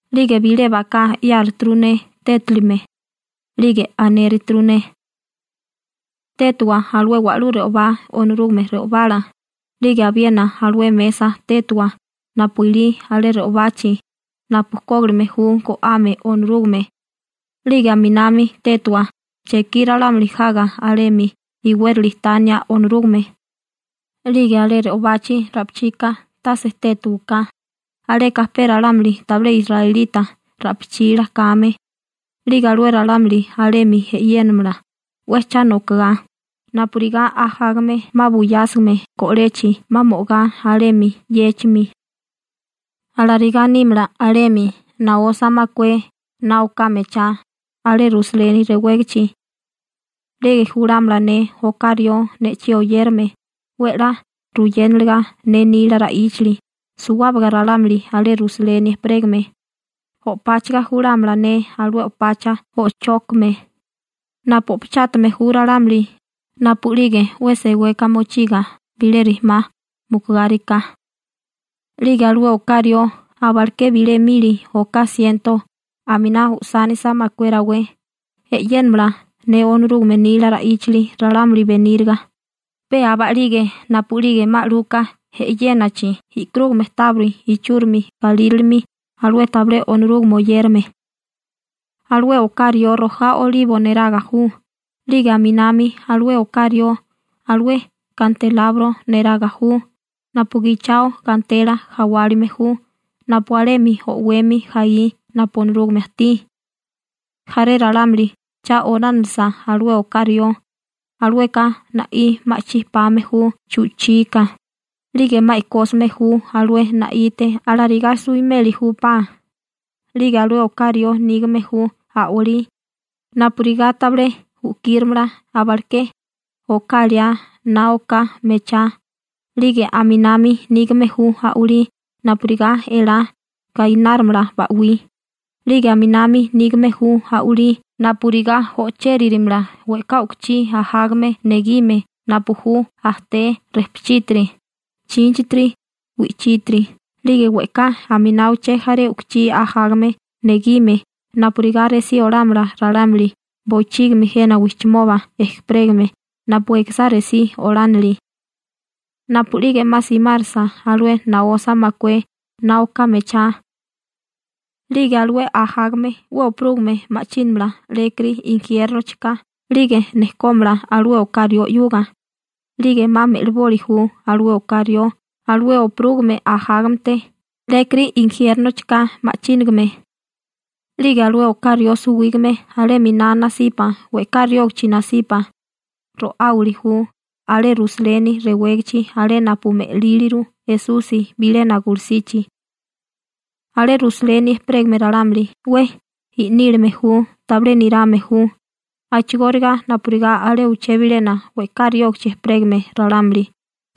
'Lige bilé baká 'yáruturu ne tétilime, 'lige anéruturu ne: ―Tétiwa alué wa'lú re'obá Onorúgame re'obala, 'lige abiena alué mesa tétiwa napu ilí alé re'obachi napu kógilime ju go'ame Onorúgame, 'lige aminami tétiwa chekí ralámuli jaga alemi iwérali tania Onorúgame. 'Lige alé re'obachi ra'pichika tase tétiwaká, aleka pe ralámuli tabilé israelita ra'pichila kame, 'lige alué ralámuli alemi e'yénamala 'we cha nokigá, napurigá ajágame 'ma buyásigame go'lechi 'ma mo'gá alemi 'yéchimi. Alarigá nímala alemi naosa makué na oká mechá alé Rusaleni rewégichi. 'Lige julámala ne oká rió ne'chí oyérame 'we 'la ruyénaliga ne nila ra'íchali suwábaga ralámuli alé Rusaleni ejperégame, o'páchaga julámala ne alué o'pacha o'chókame napu o'pachátame ju ralámuli napu'lige 'we seweka mochiga bilé rijimá mukugáriká. 'Lige alué oká rió abaleké bilé mili oká siento aminá usánisa makué rawé (oká liá na oká mechá) e'yénamala ne Onorúgame nila ra'íchali ralámuli beníriga, pe aba'lige napu'lige 'ma 'luka e'yénachi e'karúgame tábiri ichúrimi galírilimi alué tabilé Onorúgame oyérame. Alué oká rió rojá olibo neraga ju, 'lige aminami alué oká rió alué kantelabro neraga ju napu gichao gantela jawálime ju, napu alemi o'wemi jaí napu Onorúgame ajtí. Jaré ralámuli cha olánilisa alué oká rió, alueka na'í ma'chí pame ju chu'chika, 'lige 'ma e'kósime ju alué na'ite. Alarigá suwimeli júpá. 'Lige alué oká rió nígame ju a'walí napurigá tabilé u'kírimala abaleké oká liá na oká mechá, 'lige aminami nígame ju a'walí napurigá elá gainárimala ba'wí, 'lige aminami nígame ju a'walí napurigá o'chéririmala we'ká u'kuchí ajágame negime napu ju ajté, rejpuchítiri, chínchitiri, wi'chítiri 'lige we'ká aminá uché jaré u'kuchí ajágame negime napurigá resí olámala ralámuli bochígimi jena wijchimoba ejperégame napu ekisá resí olánili. Napu'lige 'ma simárisa alué naosa makué na oká mechá, 'lige alué ajágame 'we opurúgime ma'chínamala 'lékiri injiérnochika 'lige nejkómala alué oká rió 'yuga, 'lige 'ma me'liboli ju alué oká rió alué opurúgime ajágamete 'lékiri injiérnochika ma'chínigame. 'Lige alué oká rió suwígame alé 'miná nasipa we'ká riógichi nasipa ro'áwili ju alé Rusaleni rewégichi alé napu me'líliru Esusi bilena gulusichi. Alé Rusaleni ejperégame ralámuli 'we i'nílame ju tabilé nirame ju, a'chigóriga napurigá alé uché bilena we'ká riógachi ejperégame ralámuli,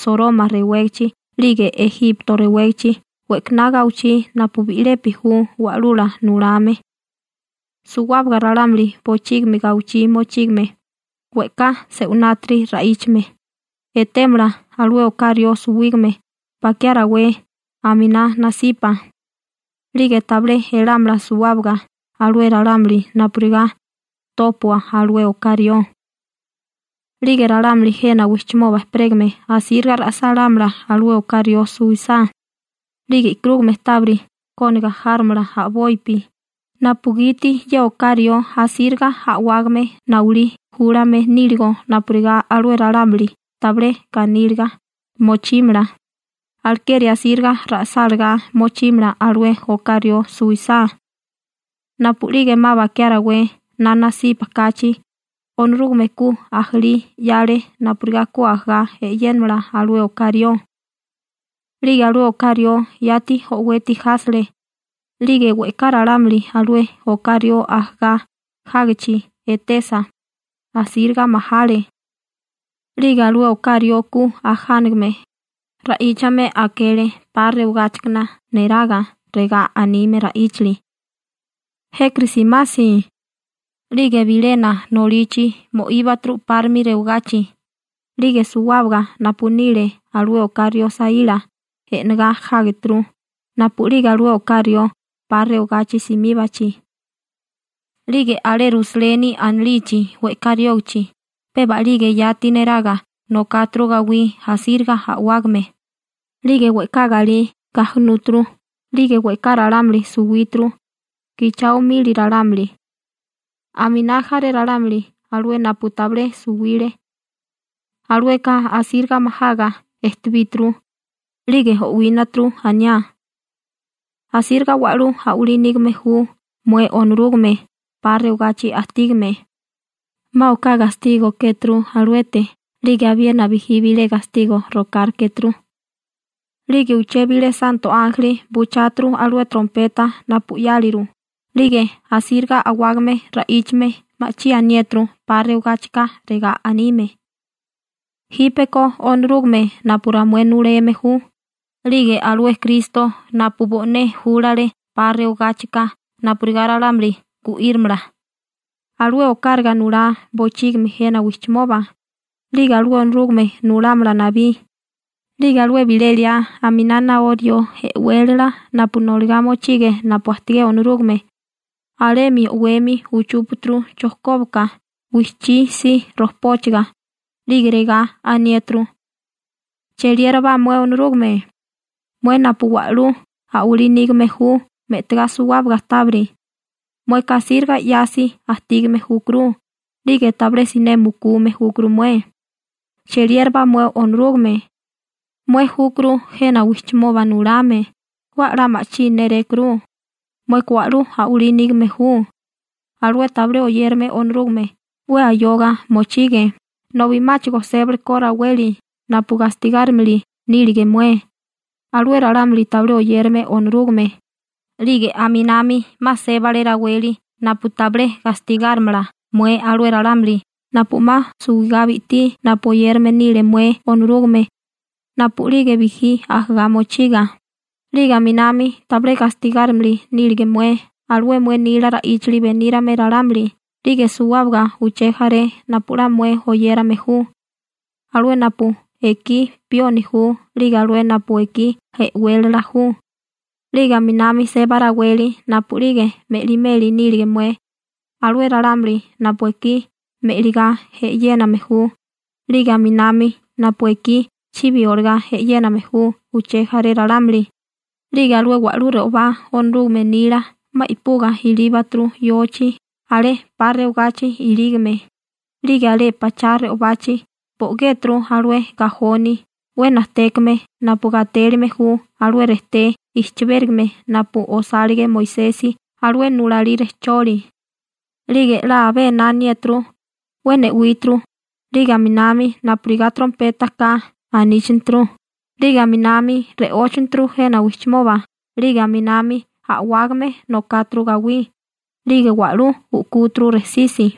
Soroma rewégachi 'lige Ejipto rewégachi we'kaná gawichí napu bi'lepi ju wa'lula nulame. Suwábaga ralámuli bochígimi gawichí mochígame, we'ká se'winátiri ra'íchame, etémala alué oká rió suwígame bakiá rawé aminá nasipa, 'lige tabilé elámala suwábaga alué ralámuli napurigá tópua alué oká rió. 'Lige ralámuli jena wijchimoba ejperégame asíriga ra'sálámala alué oká rió suwisá, 'lige e'karúgame tábiri kóniga járomala a'bopi, napugiti ye oká rió asíriga a'wágame nawilí júlame níligo napurigá alué ralámuli tabilé ganíliga mochímala, alekeri asíriga ra'sálagá mochímala alué oká rió suwisá. Napu'lige 'ma bakiá rawé na nasipa kachi, Onorúgame ku ajalí 'yale napurigá ku ajagá e'yénamala alué oká rió, 'lige alué oká rió yati o'weti jásele, 'lige we'ká ralámuli alué oká rió ajagá jágichi etesa, asíriga majale. 'Lige alué oká rió ku ajánigame, ra'íchame akele 'pa rewagáchikana neraga, regá anime ra'íchali: ―Jékiri simasi: 'Lige bilena nolichi mo'íbaturu 'párimi rewagachi. 'Lige suwábaga napu nile alué oká rió saíla e'negá jágeturu napu'lige alué oká rió 'pa rewagachi simíbachi. 'Lige alé Rusaleni anilichi we'ká riógachi peba a'lige yati neraga nokáturu gawí asíriga a'wágame, 'lige we'ká galí gajunúturu, 'lige we'ká ralámuli suwíturu, gichao mili ralámuli. Aminá jaré ralámuli alué napu tabilé suwile, alueka asíriga majaga ejtebíturu, 'lige o'wínaturu aniá: ―Asíriga wa'lú a'walí nígame ju mué Onorúgame 'pa rewagachi ajtígame. 'Ma oká gastigo kéturu aluete 'lige abiena bijí bilé gastigo rokárekéturu. 'Lige uché bilé santo ánjeli bucháturu alué trompeta napu 'yáliru, 'lige asíriga a'wágame ra'íchame ma'chí aniéturu 'pa rewagáchika, regá anime: Jípeko Onorúgame napu ramué nuleme ju 'lige alué Kristo napu bo'né júlale 'pa rewagáchika napurigá ralámuli gu'írimala, alué okáraga nulá bochígimi jena wijchimoba. 'Lige alué Onorúgame nulámala nabí. 'Lige alué bilé liá aminá naó rió e'wélala napu noligá mochige napu ajtigé Onorúgame, alemi o'wemi uchúpaturu chojkóbaka wijchí si rojpóchaga, 'lige regá aniéturu: Cheliérabá mué Onorúgame, mué napu wa'lú a'walí nígame ju me'tigá suwábaga tábiri. Mueka asíriga 'yasi ajtígame júkuru, 'lige tabilé siné mukume júkuru mué. Cheliérabá mué Onorúgame, mué júkuru jena wijchimoba nulame 'we 'la ma'chí nérékuru. Mueka wa'lú a'walí nígame ju. Alué tabilé oyérame Onorúgame 'we ayoga mochige nobi 'máchigo sébaleko raweli napu gastigárimili nílige mué alué ralámuli tabilé oyérame Onorúgame, 'lige aminami 'ma sébale raweli napu tabilé gastigárimala mué alué ralámuli napu 'ma suwigá bi'tí napu oyérame nile mué Onorúgame napu'lige bijí ajagá mochiga, 'lige aminami tabilé gastigárimili nílige mué alué mué nila ra'íchali benírame ralámuli 'lige suwábaga uché jaré napu 'la mué oyérame ju, alué napu ekí pioni ju 'lige alué napu ekí e'wélala ju. 'Lige aminami seba raweli napu'lige me'limeli nílige mué alué ralámuli napu ekí me'ligá e'yéname ju, 'lige aminami napu ekí chibi olagá e'yéname ju uché jaré ralámuli. 'Lige alué wa'lú re'obá Onorúgame nila 'ma i'puga ilíbaturu yochi alé 'pa rewagachi ilígame, 'lige alé pachá re'obachi bo'géturu alué gajoni 'we najtékame napu gatélime ju alué rejté i'chibérigime napu osálige Moisesi alué nulalí rejcholi. 'Lige 'la abé ená aniániéturu 'we ne'wíturu 'lige aminami napurigá trompeta ka aníchaneturu, 'lige aminami re'óchaneturu jena wijchimoba 'lige aminami a'wágame nokáturu gawí, 'lige wa'lú u'kúturu rejsisi.